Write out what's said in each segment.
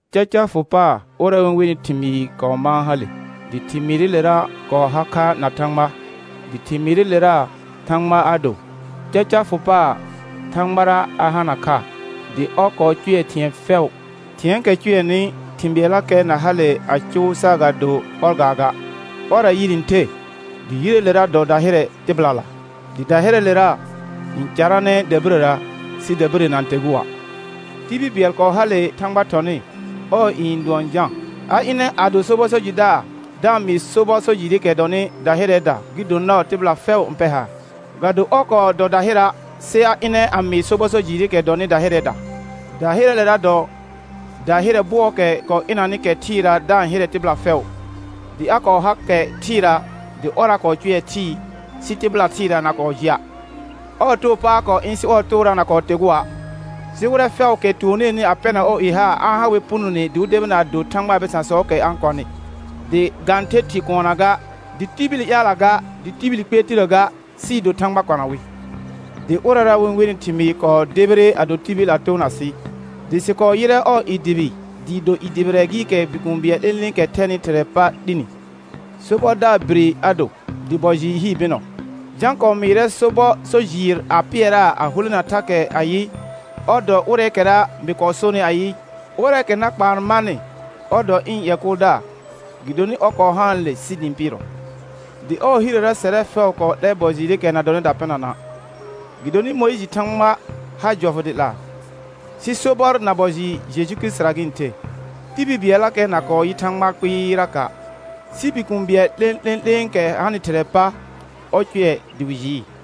Caca fʋ paar ʋrɛ wɩ-n wenɩ Thɩmɩɩr kɔɔ mãa hale, dɩ Thɩmɩɩrɩlera kɔɔ har kha na Thãgba, dɩ Thɩmɩɩrɩlera Thãgba a do. Caca fʋ paar Thãgbara a hana kha. Dɩ ɔr kɔɔ cʋɛ thɩ̃ɛ fɛʋ, thɩ̃ɛɛkɛ cʋɛnɩ thɩ̃ bɩɛllakɛ na hale a cʋʋ saagado ɔr gaaga. Ɔrra yire n the, dɩ yireelera dɔ dahɩrɛ tɩbɩlala. Dɩ dahɩrɛɛlera n caranɛ dabirəra sɩ dabirə na-n tegua'. Tibil bɩɛl kɔɔ hale Thãgba thɔnɩ, ɔɔ i n dʋɔn Jã. A ɩnɛ a do sobɔ so jɩdaar da-n mɩɩ sobɔ so jɩɩrɩkɛ dɔnɩ dahɩrɛɛda, gɩ do nɔɔ tɩbɩla fɛʋ n pɛr haar. Ga do ɔr kɔɔ dɔ dahɩra', sɩ a ɩnɛ a mɩɩ sobɔ so jɩɩrɩkɛ dɔnɩ dahɩrɛɛda. Dahɩrɛɛle dɔ dahɩrɛ bɔɔkɛ kɔɔ ɩnanɩ kɛ thɩɩra da-n hɩrɛ tɩbɩla fɛʋ. Dɩ a kɔɔ har kɛ thɩɩra dɩ ɔrra kɔɔ cʋɛ thɩɩ, sɩ tɩbɩla thɩɩra na kɔɔ jɩa'. Ɔɔ too pa a kɔɔ ɩ̃, sɩ ɔɔ toora na kɔɔ tegua'. Sɩ wɩrɛ fɛʋʋkɛ tuoneeni a pɛrna ɔɔ i haar, a-n ha wɛr punone dɩ wɩ debina a do Thãgbaa bɩsãsɔɔkɛ a-n kɔnɩ, dɩ ga-n the thɩ kuunna ga, dɩ tibili ƴaalla ga, dɩ tibili kpɩɛr tirə ga, sɩɩ do Thãgba kɔna wɩ. Dɩ ʋrɛra wɩ-n wenɩ Thɩmɩɩr kɔɔ debire a do tibil a toona sɩ. Dɩ sɩ kɔɔ yɩrɛ ɔɔ i dʋbɩ dɩɩ do i dʋbɩrɛ gɩɩkɛ Bikũu bɩɛl 'lẽ'lẽ'lẽekɛ thɛnɩ Thɩrɛɛ pa 'lini. Sobɔdaar bire a do, dɩ bɔ jɩɩr hii bɩnɔ. Jã kɔɔ mɩɩrɛ sobɔ so jɩɩr a pɩɛraa a hulena thakɛ ayɩ, ɔr dɔ ʋrɛɛkɛra mɩ kɔɔ sonɩ ayɩ, ʋrɛɛkɛ na kpaan marnɩ, ɔr dɔ ɩ̃ ƴɛ kʋʋldaar, gɩdonɩ ɔr kɔɔ haanle sɩ dɩ ɩ̃ pɩɩrɔ. Dɩ ɔɔ hirəra sɛrɛ fɛʋ kɔɔ 'lɛ bɔ jɩɩrɩkɛ na dɔnɩ dapɩnana'. Gɩdonɩ Mʋɩjɩ Thãgba ha jɔfʋ dɩ 'laa, sɩ sobɔr na bɔ jɩɩr Jeju Kirisitira gɩ-n the. Tibil bɩɛllakɛ na kɔɔ yɩ Thãgba kpɩɩraka', sɩ Bikũu bɩɛl 'lẽ'lẽ'lẽekɛ hanɩ Thɩrɛɛ pa, ɔr cʋɛ dɩ wɩ jɩɩ.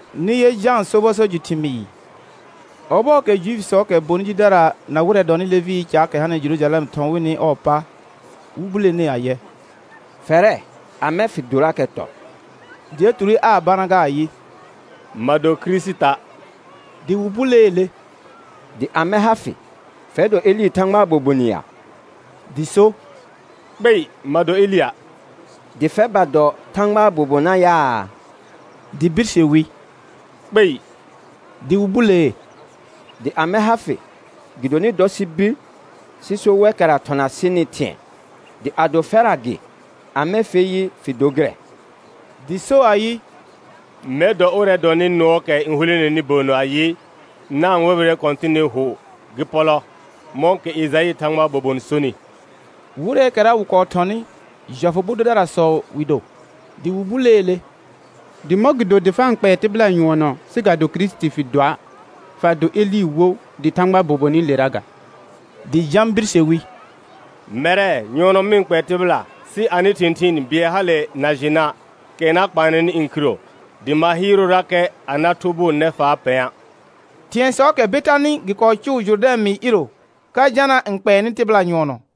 Nɩ yɛ Jãa sobɔ so jɩ thɩmɩɩ, ɔbɔɔkɛ Juifisɔɔkɛ bonɩ jidara na wɩrɛ dɔnɩ Levɩɩ caakɛ hanɩ Jerujalɛm thɔ̃ wɩnɩ ɔɔ pa, wɩ bulenee ayɛ: Fɛrɛ, amɛ fɩ dorakɛ tɔr? Dɩ a ture aa bana ga ayɩ: Ma do Kirisita'. Dɩ wɩ buleele: Dɩ amɛ ha fɩ? Fɛr dɔ Elɩ Thãgbaa bobon ya? Dɩ so: Kpei ma do Elɩa'. Dɩ fɛr ba dɔ Thãgbaa bobonna yaa? Dɩ birse wi: Kpei. Dɩ wɩ bulee: Dɩ amɛ ha fɩ? Gɩdonɩ dɔ sɩ bir sɩ so wɛkɛra thɔna sɩnɩ thɩ̃ɛ. Dɩ ado fɛrra gɩ, amɛ fer yɩ fɩ dor gɩrɛ? Dɩ so ayɩ: «Mɛr dɔ ʋrɛ dɔnɩ nʋɔɔkɛ n huleneni bəənnə ayɩ: Na-n wɛbɩrɛ Kɔ̃tɩnɩ hʋ gɩ pɔlɔ», mɔ̃kɛ Ejaɩ Thãgbaa bobon sonɩ. Wɩrɛɛkɛra wɩ kɔɔ thɔnɩ, jɔfʋ bʋ dʋdarasɔ wɩ do. Dɩ wɩ buleele: Dɩ mɔ̃gɩdo dɩ fa-n kpɛɛ tɩbɩla nyʋɔnɔ sɩ ga do Kirisiti fɩ doa', fa do Elɩ wo, dɩ Thãgbaa bobonɩlera ga? Dɩ Jã birse wi: Mɛrɛ, nyʋɔnɔ mɩ-n kpɛɛ tɩbɩla, sɩ anɩ thɩ̃thɩɩn bɩɛl hale na jɩna', kɛ na kpaannɩ ɩ̃ khiro, dɩ ma hɩɩrʋʋrakɛ a na thʋbʋʋ nɛfaa pɛ̃a'. Thɩ̃ɛsɔɔkɛ Betanɩ gɩ kɔɔ cʋʋ Jʋrdɛ̃ mɩɩr iiro ka Jana n kpɛɛnɩ tɩbɩla nyʋɔnɔ.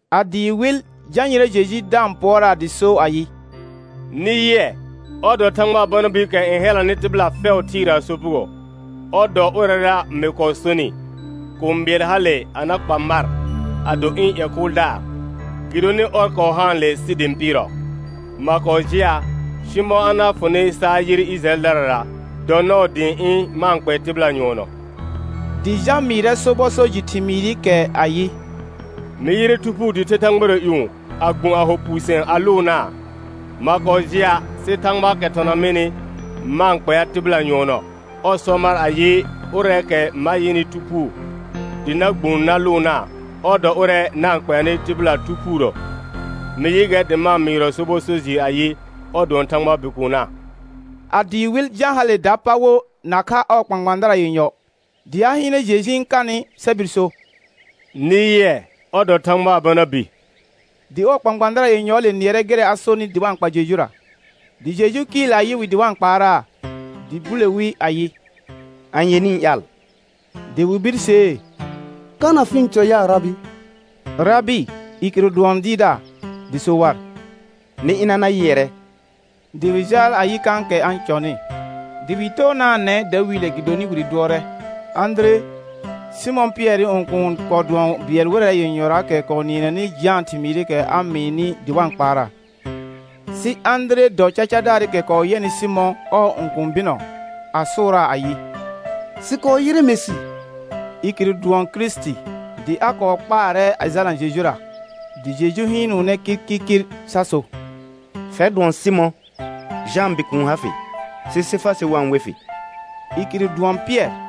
A dɩɩ wɩl, Jã yɩrɛ Jeju da-n pʋɔraa dɩ so ayɩ: Nɩ yɩɛ, ɔr dɔ Thãgbaa Bana biikɛ n hɛlanɩ tɩbɩla fɛʋ thɩɩraa sopugo. Ɔr dɔ ʋrɛra mɩ kɔɔ sonɩ: Kũu bɩɛl hale a na kpa mar a do ɩ̃ ƴɛ kʋʋldaar, gɩdonɩ ɔr kɔɔ haanle sɩ dɩ ɩ̃ pɩɩrɔ. Ma kɔɔ jɩa', sɩ mɔ̃ a na fʋnɩ sa a yɩr Ɩjɩrayɛldarara dɔ nɔɔ dɩ ɩ̃ ɩ̃ ma-n kpɛɛ tɩbɩla nyʋɔnɔ. Dɩ Jã mɩɩrɛ sobɔ so jɩ thɩmɩɩrɩkɛ ayɩ: Mɩ yɩrɛ Thu Phuu dɩ the thãgbara ƴũ, a gbũ a ho puusɩ̃ɛ, a lʋʋnaa. Ma kɔɔ jɩa', sɩ Thãgbaakɛ thɔna mɩnɩ ma-n kpɛa tɩbɩla nyʋɔnɔ, ɔr sɔ mar ayɩ, ʋrɛɛkɛ ma yɩnɩ Thu Phuu dɩ na gbũ na lʋʋnaa, ɔr dɔ ʋrɛ na-n kpɛanɩ tɩbɩla Thu Phuurə. Mɩ yɩ gɛr dɩ ma-n mɩɩrɔ sobɔ so jɩɩr ayɩ: Ɔr dʋɔn Thãgbaa Bikuunna. A dɩɩ wɩl, Jã hale dapa wo nakha ɔɔ kpãkpãadara yenyɔ. Dɩ a hɩɩnɛ Jeju n kanɩ sa bir so: Nɩ yɩɛ, ɔr dɔ Thãgbaa Bana bi. Dɩ ɔɔ kpãkpãadara yenyɔɔle nɩɛrɛ gɩrɛ a sonɩ dɩ wa n kpa Jejura. Dɩ Jeju kɩɩl a yɩ wɩ dɩ wa-n kpaaraa, dɩ bule wi ayɩ: Anye nɩ-n ƴaal? Dɩ wɩ birsee: Kana fɩ-n cɔ ya, Rabɩ? Rabɩ, i kɩrʋ dʋɔn Dɩɩrdaar. Dɩ so war: Nɩ ɩna na yɩɛrɛ; dɩ wɩ jaal a yɩ kãkɛ a-n cɔnɩ. Dɩ wɩ toonaanɛ dawiile gɩdonɩ wire dʋɔrɛ. Ãdire, Sɩmɔ̃ Pɩɛrɩ õkuun kɔɔ dʋɔn bɩɛl wɩrɛ yenyɔraakɛ kɔɔ nɩɛnɛnɩ Jãa thɩmɩɩkɛ a mɩɩnɩ dɩ wa-n kpaaraa. Sɩ Ãdire dɔ cacadaarɩkɛ kɔɔ yɛnɩ Sɩmɔ̃, ɔɔ õkũu bɩnɔ, a sʋʋraa ayɩ: Sɩ kɔɔ yɩrɛ Mesɩ. I kɩrʋ dʋɔn Kirisiti. Dɩ a kɔɔ kpaarɛ a jalna Jejura, dɩ Jeju hɩɩnʋʋnɛ kirkirkir sa so: Fɛr dʋɔn Sɩmɔ̃, Jãa bikuun ha fɩ, sɩ Sefasɩ wa-n we fɩ. I kɩrʋ dʋɔn Pɩɛr.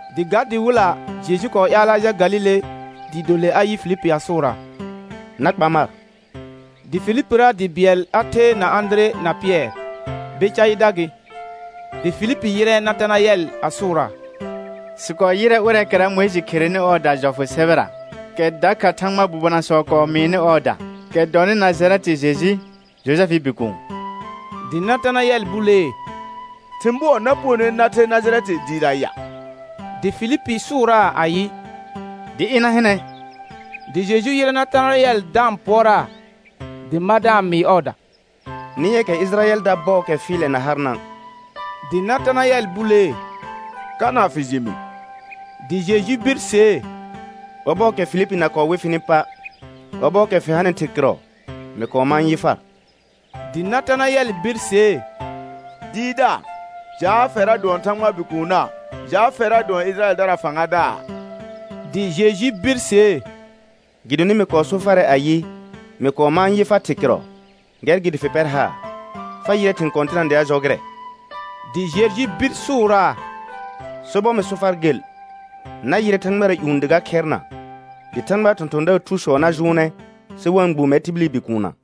Dɩ ga dɩ wɩlla, Jeju kɔɔ ƴaalɛ a jal Galile dɩɩ do le a yɩ Filipi a sʋʋraa: Na kpa mar. Dɩ Filipira dɩ bɩɛl a the na Ãdire na Pɩɛr, Bɛcaɩda gɩ. Dɩ Filipi yɩrɛ Natanayɛl a sʋʋraa: Sɩ kɔɔ yɩrɛ ʋrɛɛkɛra Mʋɩjɩ kherenɩ ɔɔda jɔfʋ sɛbɛra, kɛ dakha Thãgbaa bobonasɔ kɔɔ mɩɩnɩ ɔɔda, kɛ dɔnɩ Najarɛtɩ Jeju, Jojɛfɩɩ bikuun. Dɩ Natanayɛl bulee: Thɩ̃ bʋɔ na punone na the Najarɛtɩ dɩɩra ya? Dɩ Filipi sʋʋraa ayɩ: Dɩ ɩna hɩnɛ. Dɩ Jeju yɩrɛ Natanayɛl da-n pʋɔraa, dɩ ma da-n mɩɩ ɔɔda: Nɩ yɛ kɛ Ɩjɩrayɛlda bɔɔkɛ fɩɩlɛ na harna'. Dɩ Natanayɛl bulee: Kana fɩ jɩ mɩ? Dɩ Jeju birsee: Ɔbɔɔkɛ Filipi na kɔɔ we fɩnɩ pa', ɔbɔɔkɛ fɩ hanɩ thɩr kɩrɔ, mɩ kɔɔ mãa yɩ far. Dɩ Natanayɛl birsee: Dɩɩrdaar, jaa fɛrra dʋɔn Thãgbaa Bikuunna, jaa fɛrra dʋɔn Ɩjɩrayɛldaraa fãgadaar. Dɩ Jeju birsee: Gɩdonɩ mɩ kɔɔ so farɛ ayɩ, mɩ kɔɔ mãa yɩ far thɩr kɩrɔ, gɛr gɩ dɩ fɩ pɛr haar. Fa yɩrɛ thɩ̃ kɔ̃tɩna dɩ a jɔ gɩrɛ Dɩ Jeju bir sʋʋraa: Sobɔr mɩ so far gel, na yɩrɛ thãgbara ƴũ dɩ ga khɛrna, dɩ Thãgbaa thɔ̃thɔ̃daar thusɔ na jʋʋnɛ sɩ wa-n gbũ mɛr tibili Bikuunna.